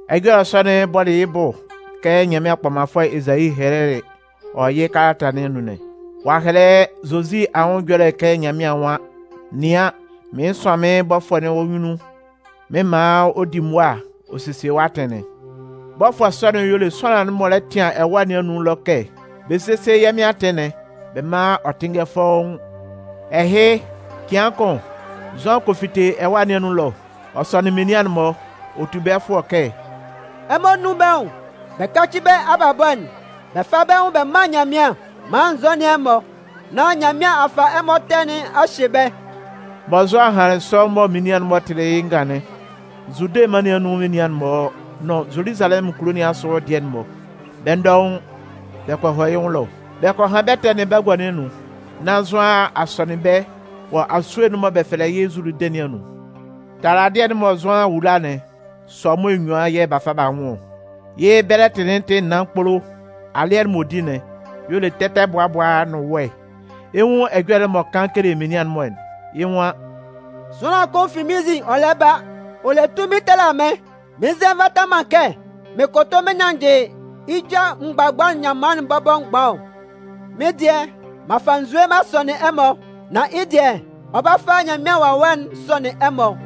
Ɛjɔlɛ sɔ'n bɔlɩ yɩ́ bʋ kɛ Nyanmɩan Kpɔmanfʋɛ Ezayi hɛlɛlɩ wɔ yɩ́ kalata nɩn anun'n. Ɔ'a hɛlɛ Zozi anwʋn ɛjɔlɛ'n kɛ Nyanmɩan nwan: Nɩan, mɩn 'sʋan mɩ́n bɔfʋɛ'n wɔ́ nyunnun mɩn 'man ɔ di mʋa ɔ sesie wɔ́ atɩn'n. Bɔfʋɛ sɔ'n y'ɔ le sʋanlan'n m'ɔ lɛ tɩan ɛwâ nɩn anun ɛlɔ kɛ: Bɛ sésie yɛ́ Mɩn atɩn'n bɛ mán ɔ tɩ́nngɛ fɔ́ʋ́n! Ɛhɩ, cɩan kʋn, Zʋan kɔ fite ɛwâ nɩn anun ɛlɔ. Ɔ sɔnɩn menian'n-mɔ. Ɔ tu bɛ́ fʋɔ kɛ: “Ɛmɔ nún bɛ́ nwʋn bɛ káci bɛ́ abalabɔ'n bɛ fá bɛ́ nwʋn bɛ mán Nyanmɩan maan n zɔ́nɩn ɛmɔ, nán Nyanmɩan a fa ɛmɔ ɛtɛ nɩn a hye bɛ́.” Mɔ Zʋan hanlɩn sɔ mɔ menian'n-mɔ tɩlɩ yɩ́ ngan'n, Zude mân nɩn anun menian'n-mɔ nʋn Zoluzalɛmʋn kulo nɩn asʋ dɩɛ'n-mɔ, bɛ́ dɔʋn, bɛ kɔ hɔ yɩ́ nwʋn ɛlɔ. Bɛ kɔ han bɛ́ ɛtɛ'n bagua nɩn anun, nán Zʋan a sɔnɩn bɛ́ wɔ asue'n mɔ bɛ fɛlɛ yɩ́ Zuludɩn nɩn anun. Taladɩɛ'n mɔ Zʋan wula'n, sʋamo enyuan yɛ̂ b'a fa b'a nwʋn ɔ. Yɩ́ bɛlɛtɩ'n tɩ naan kpolo. Alɩɛ'n m'ɔ di'n, y'ɔ le tɛtɛbʋabʋa nʋn wɛ. Ɛ 'nwun ɛjɔlɛ'n m'ɔ kan kele menian'n-mɔ'n. Yɩ́ nwan: “Sʋanlan kʋn fi mɩ́n nzin ɔ lɛ ba, ɔ le tunmin tala mɩ́n, mɩn nzɛ nvata man kɛ mɩn kʋtʋ mɩn nyannjɩ yɩ́ ja mgbabʋa'n nyanman'n bɔbɔ mgban ɔ. Mɩ́n dɩɛ, m'an fa nzue m'an sɔnɩn ɛmɔ, nan yɩ́ dɩɛ, ɔ 'ba fa Nyanmɩan Wawɛ'n sɔnɩn ɛmɔ.”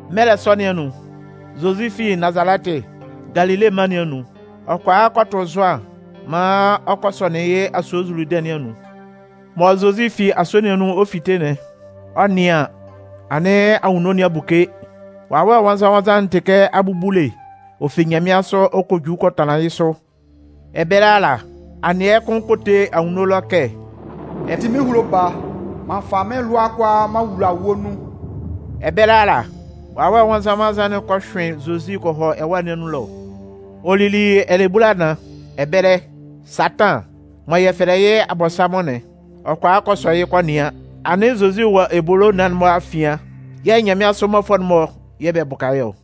Mɛlɛ sɔ nɩn anun, Zozi fi Nazalɛtɩ, Galile mân nɩn anun, ɔ kɔ a kɔ tʋ Zʋan maan ɔ kɔ sɔnɩn yɩ́ asue Zuludɩn nɩn anun. Mɔ Zozi fi asue nɩn anun ɔ 'fite'n, ɔ 'nɩan an, anɩn anwunno nɩn a buke, Wawɛ Nwannzan-nwannzan'n tɩ kɛ abubule, ɔ fi nyanmɩansʋ ɔ kɔ ju kɔ tanlan yɩ́ sʋ. Ɛbɛlɛ ala, anɩɛ kʋn kɔ te anwunno ɛlɔ kɛ: “Ɛ tɩ mɩ́n ehulo Baa, m'an fa mɩ́n lʋa'n kʋalaa m'an wula wɔ́ nun.” Ɛbɛlɛ ala, Wawɛ'n Nwannzan-nwannzan'n kɔ hyʋɩn Zozi kɔ hɔ ɛwâ nɩn anun ɛlɔ. Ɔ lili ɛlɛbulanan. Ɛbɛlɛ, Satan (mɔ yɛ fɛlɛ yɩ́ Abɔnsanmʋn'n), ɔ kɔ a kɔ sɔ yɩ́ kɔ nɩan. Anɩn Zozi wɔ ebolo naan'n-mɔ afian yɛ̂ nyanmɩansʋ mmɔfʋɛ'n-mɔ yɛ̂ bɛ bʋka yɩ́ ɔ.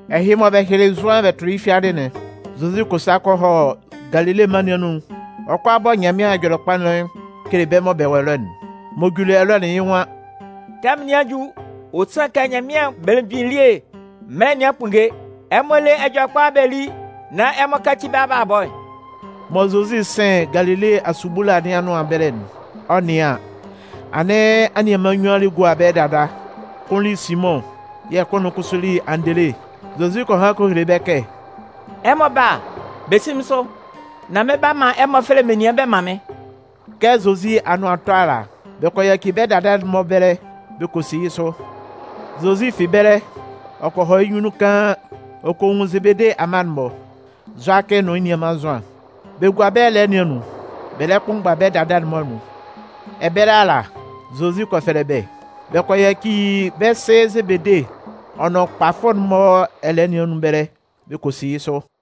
Ɛhɩ mɔ bɛ hyɩlɩ Zʋan bɛ tʋlɩ yɩ́ fiadɩ'n, Zozi kɔ sa kɔ hɔ Galile mân nɩn anun ɔ 'kɔ a bɔ Nyanmɩan Ɛjɔlɛkpa'n kele bɛ́ mɔ bɛ wɔ ɛlɔ'n. M'ɔ juli ɛlɔ'n yɩ́ nwan: “Tɛmʋn nɩn a ju, ɔ sanlɩn kɛ Nyanmɩan Belemgbin elie mɛlɛ nɩn a kpunnge. Ɛmɔ lé Ɛjɔlɛkpa'n bɛ li nán ɛmɔ káci bɛ́ abalabɔ'n!” Mɔ Zozi 'sɩn Galile asubula nɩn anʋan ɛbɛlɛ'n, ɔ 'nɩan an, anɩn anianman nnyuan lɛ gua bɛ́ dada. Kʋn li Simʋn yɛ̂ kʋn'n kʋsʋ li Andele. Zozi kɔ han kɔ hele bɛ́ kɛ: “Ɛmɔ bála, bɛ sí mɩ́n sʋ, nán mɩn 'ba man ɛmɔ fɛlɛ menian bɛ man mɩ́n.” Kɛ Zozi anʋan 'tɔ ala, bɛ kɔ yaci bɛ́ dada'n-mɔ ɛbɛlɛ, bɛ kɔ si yɩ́ sʋ. Zozi fi ɛbɛlɛ, ɔ kɔ hɔ yɩ́ nyunnun kaan, ɔ kɔ nwun Zebede amma'n-mɔ: Zʋakɩ nʋn yɩ́ nianman Zʋan. Bɛ gua bɛ́ ɛlɛɛ nɩn anun, bɛ lɛ kpʋnmgba bɛ́ dada'n-mɔ anun. Ɛbɛlɛ ala, Zozi kɔ fɛlɛ bɛ́. Bɛ kɔ yaci bɛ́ sɩ Zebede ɔ nʋn kpafʋ'n-mɔ ɛlɛɛ nɩn anun ɛbɛlɛ, bɛ kɔ si yɩ́ sʋ.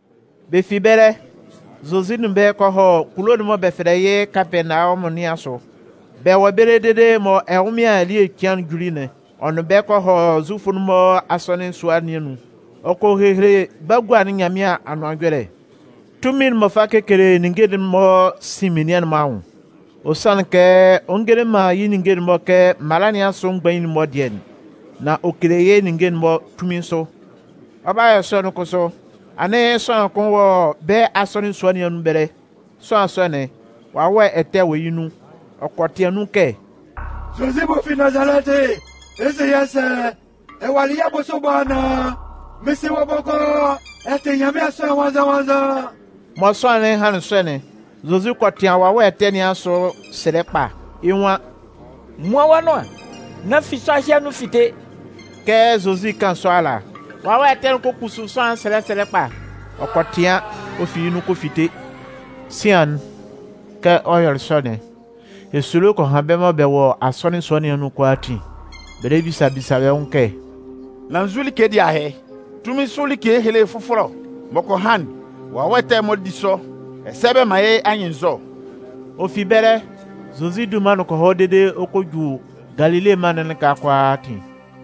Bɛ fi ɛbɛlɛ, Zozi nʋn bɛ́ kɔ hɔ kulo'n mɔ bɛ fɛlɛ yɩ́ Kapɛɛnawɔmʋn nɩn asʋ. Bɛ wɔ ɛbɛlɛ dede mɔ ɛnwʋnmɩan ele cɩan'n juli'n, ɔ nʋn bɛ́ kɔ hɔ Zufʋ'n-mɔ asɔnɩn sua nɩn anun. Ɔ kɔ hehele bagua'n Nyanmɩan Anʋan Ɛjɔlɛ. Tunmin'n m'ɔ fa kekele ninnge'n-mɔ'n sin menian'n-mɔ anwʋn. Ɔ sanlɩn kɛ ɔ ngele man yɩ́ ninnge'n-mɔ kɛ mala nɩn asʋ mgbain'n-mɔ dɩɛ'n, nan ɔ kele yɩ́ ninnge'n-mɔ tunmin sʋ. Ɔ 'ba yɔ sɔ'n kʋsʋ, anɩn sʋanlan kʋn wɔ bɛ́ asɔnɩn sua nɩn anun ɛbɛlɛ. Sʋanlan sɔ'n, wawɛ ɛtɛ wɔ yɩ́ nun. Ɔ kɔ tɩan nun kɛ: “Zozi m'ɔ fi Nazalɛtɩ, ɛ 'se yɛ́ sɛ? Ɛ walɩ yɛ́ bʋsʋ ɛbɔ anaan? Mɩn sɩ wɔ́ bɔkɔɔ! Ɛ tɩ Nyanmɩan Sʋanlan Nwannzan-nwannzan!” Mɔ sʋanlan'n hanlɩn sɔ'n, Zozi kɔ tɩan wawɛ ɛtɛ nɩn asʋ sɛlɛ kpa. Yɩ́ nwan: “Muan wɔ́ nʋan'n nán fi sʋanlan ɛhɩ anun fite!” Kɛ Zozi 'kan sɔ ala, wawɛ ɛtɛ'n kɔ kpusu sʋanlan'n sɛlɛ sɛlɛ kpa, ɔ kɔ tɩan, ɔ fi yɩ́ nun kɔ fite. Sian'n, kɛ ɔ yɔlɩ sɔ'n, esulo kɔ han bɛ́ mɔ bɛ wɔ asɔnɩn sua nɩn anun'n kʋalaatin. Bɛ lɛ bisa bisa bɛ́ nwʋn kɛ: “Nan nzu like dɩɛ ahɩ? Tunmin sʋ like ehele fʋfɔlɛ ɔ! M'ɔ kɔ han'n, wawɛ ɛtɛ'n-mɔ di sʋ, ɛsɛ bɛ man yɩ́ anyɩnnzɔ.” Ɔ fi ɛbɛlɛ, Zozi dunman'n kɔ hɔ dede kɔ ju Galile mân'n lɩka kʋalaatin.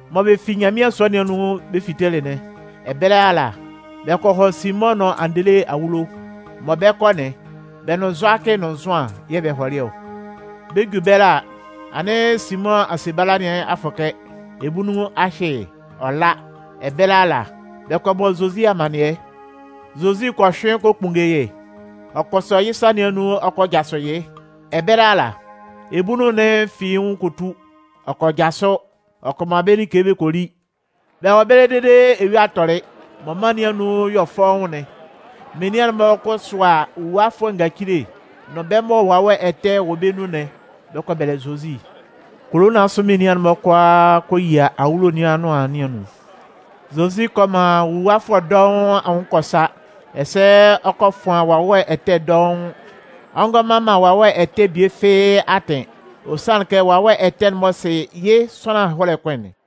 Mɔ Bɛ fi Nyanmɩan sua nɩn anun bɛ fitelɩ'n, ɛbɛlɛ ala, bɛ kɔ hɔ Simʋn nʋn Andele awulo. Mɔ bɛ 'kɔ'n, bɛ nʋn Zʋakɩ nʋn Zʋan yɛ̂ bɛ hɔlɩ ɔ. Bɛ 'ju ɛbɛlɛ a, anɩn Simʋn asebala nɩn a fʋkɛ, ebunnun a hyɩ yɩ́, ɔ la. Ɛbɛlɛ ala, bɛ kɔ bɔ Zozi amannɩɛ. Zozi kɔ hyʋɩn kɔ kpunnge yɩ́, ɔ kɔ sɔ yɩ́ sa nɩn anun ɔ kɔ jasʋ yɩ́. Ɛbɛlɛ ala, ebunnun'n fi yɩ́ nwʋn kɔ tu. Ɔ kɔ jasʋ, ɔ kɔ man bɛ́ like bɛ kɔ li. Bɛ wɔ ɛbɛlɛ dede eyua'n tɔlɩ, mɔ mân nɩn anun 'yɔ fɔʋn'n, menian'n-mɔ kɔ sʋa nwuluwafʋɛ ngacile, nʋn bɛ́ mɔ wawɛ ɛtɛ wɔ bɛ́ nun'n, bɛ kɔ bɛlɛ Zozi. Kulo nɩn asʋ menian'n-mɔ kʋalaa kɔ yia awulo nɩn anʋan nɩn anun. Zozi kɔ man nwuluwafʋɛ dɔʋn anwʋn kɔ sa, ɛsɛ ɔ kɔ fʋan wawɛ ɛtɛ dɔʋn. Ɔ ngɔ man man wawɛ ɛtɛ'n bie fɩ́ɩ́ atɩn, ɔ sanlɩn kɛ wawɛ ɛtɛ'n-mɔ sɩ yɩ́ sʋanlan ɛhɔlɛ kʋn'n.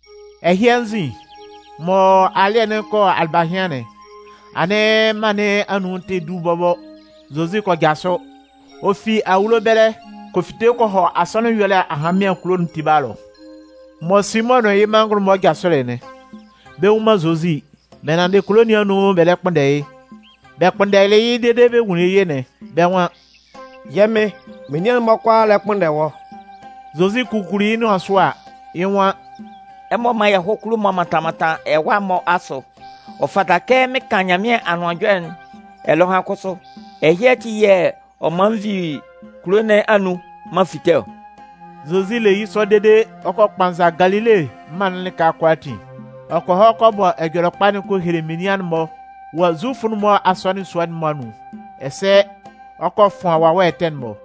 Ɛhɩ anzin, mɔ alɩ́ɛ'n 'kɔ alɩbahɩan'n, anɩn mân nɩn anun tɛ du bɔbɔ, Zozi kɔ jasʋ. Ɔ fi awulo ɛbɛlɛ kɔ fite kɔ hɔ asɔnɩn ɛyɔlɛ ahanmɩan kulo'n tiba ɛlɔ. Mɔ Simʋn nʋn yɩ́ manngʋn'n-mɔ jasʋlɩ'n, bɛ nnwun man Zozi. Bɛ nanndɩ kulo nɩn anun bɛ lɛ kpʋnndɛ yɩ́. Bɛ kpʋnndɛlɩ yɩ́ dede mɔ bɛ nwunlin yɩ́'n, bɛ́ nwan: “Yɛ́ Mɩn, menian'n-mɔ kʋalaa lɛ kpʋnndɛ wɔ́.” Zozi kukuli yɩ́ nʋan sʋ a, yɩ́ nwan: “Ɛmɔ mán yɛ hɔ́ kulo'n-mɔ mɔ bɛ mantan mantan ɛwa'n-mɔ asʋ. Ɔ fata kɛ mɩn kan Nyanmɩan Anʋan Ɛjɔlɛ ɛlɔhan kʋsʋ. Ɛhɩ ati yɛ̂ ɔ man n vi kulo nɩn anun m'an fite ɔ.” Zozi le yɩ́ sɔ dede ɔ kɔ kpanza Galile mân'n lɩka kʋalaatin. Ɔ kɔ hɔ kɔ bɔ Ɛjɔlɛkpa'n kɔ hele menian'n-mɔ wɔ Zufʋ'n-mɔ asɔnɩn sua'n-mɔ anun. Ɛsɛ ɔ kɔ fʋan wawɛ ɛtɛ'n-mɔ.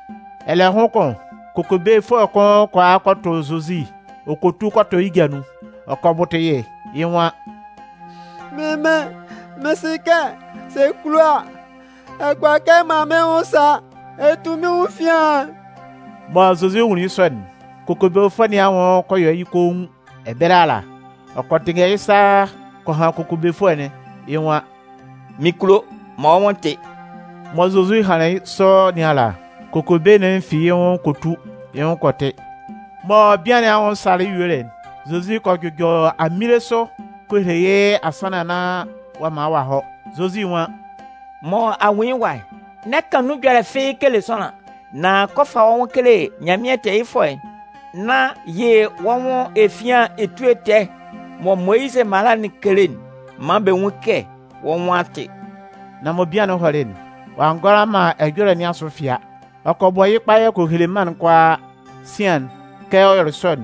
Ɛlɛhʋn kʋn, kokobefʋɛ kʋn kɔ a kɔ tʋ Zozi ɔ kɔ tu kɔ tɔ yɩ́ ja nun. Ɔ kɔ bʋtʋ yɩ́. Yɩ́ nwan: “Mɩ́n mɩn, mɩn sɩ kɛ sɛ ɛ kulo a, ɛ kʋala kɛ ɛ man mɩ́n nwʋn sa, ɛ tu mɩ́n nwʋn efian'n.” Mɔ Zozi nwunlin yɩ́ sɔ'n, kokobefʋɛ nɩn anwʋn kɔ yɔ yɩ́ koun. Ɛbɛlɛ ala, ɔ kɔ tɩnngɛ yɩ́ sa kɔ han kokobefʋɛ'n, yɩ́ nwan: “Mɩn kulo, man wɔ́ nwʋn tɩ́!” Mɔ Zozi hanlɩn sɔ nɩn ala, kokobe'n fi yɩ́ nwʋn kɔ tu, yɩ́ nwʋn kɔ tɩ. Mɔ bian nɩn anwʋn salɩ yuelɩ'n, Zozi kɔ jʋjɔ aminle sʋ kɔ hele yɩ́ asannan nán ɔ'a man ɔ'a hɔ. Zozi nwan: “Mɔ a nwun yɩ́ ɛwa'n, n'ɛ kan nun ɛjɔlɛ fɩ́ɩ́ kele sʋanlan. Nan kɔ fa wɔ́ nwʋn kele Nyanmɩan tɛɛyɩfʋɛ'n nán yɩ wɔ́ nwʋn efian etue tɛɛ'n mɔ Moyizɩ mala'n kele'n maan bɛ nwún yɩ́ kɛ wɔ́ nwʋn a tɩ.” Nan mɔ bian'n hɔlɩ'n, ɔ'a ngʋala man ɛjɔlɛ nɩn asʋ fɩa. Ɔ kɔ bɔ yɩ́ kpayɛ kɔ hele mân'n kʋalaa. Sian'n, kɛ ɔ yɔlɩ sɔ'n,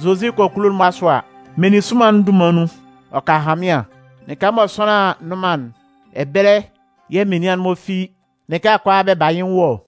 Zozi kɔ kulo'n-mɔ asʋ a, meninsʋnman'n dunman nun, ɔ ka ahanmɩan, lɩka mɔ sʋanlan nnʋn man'n, ɛbɛlɛ yɛ̂ menian'n-mɔ fi lɩka kʋalaa bɛ ba yɩ́ nwʋn ɔ.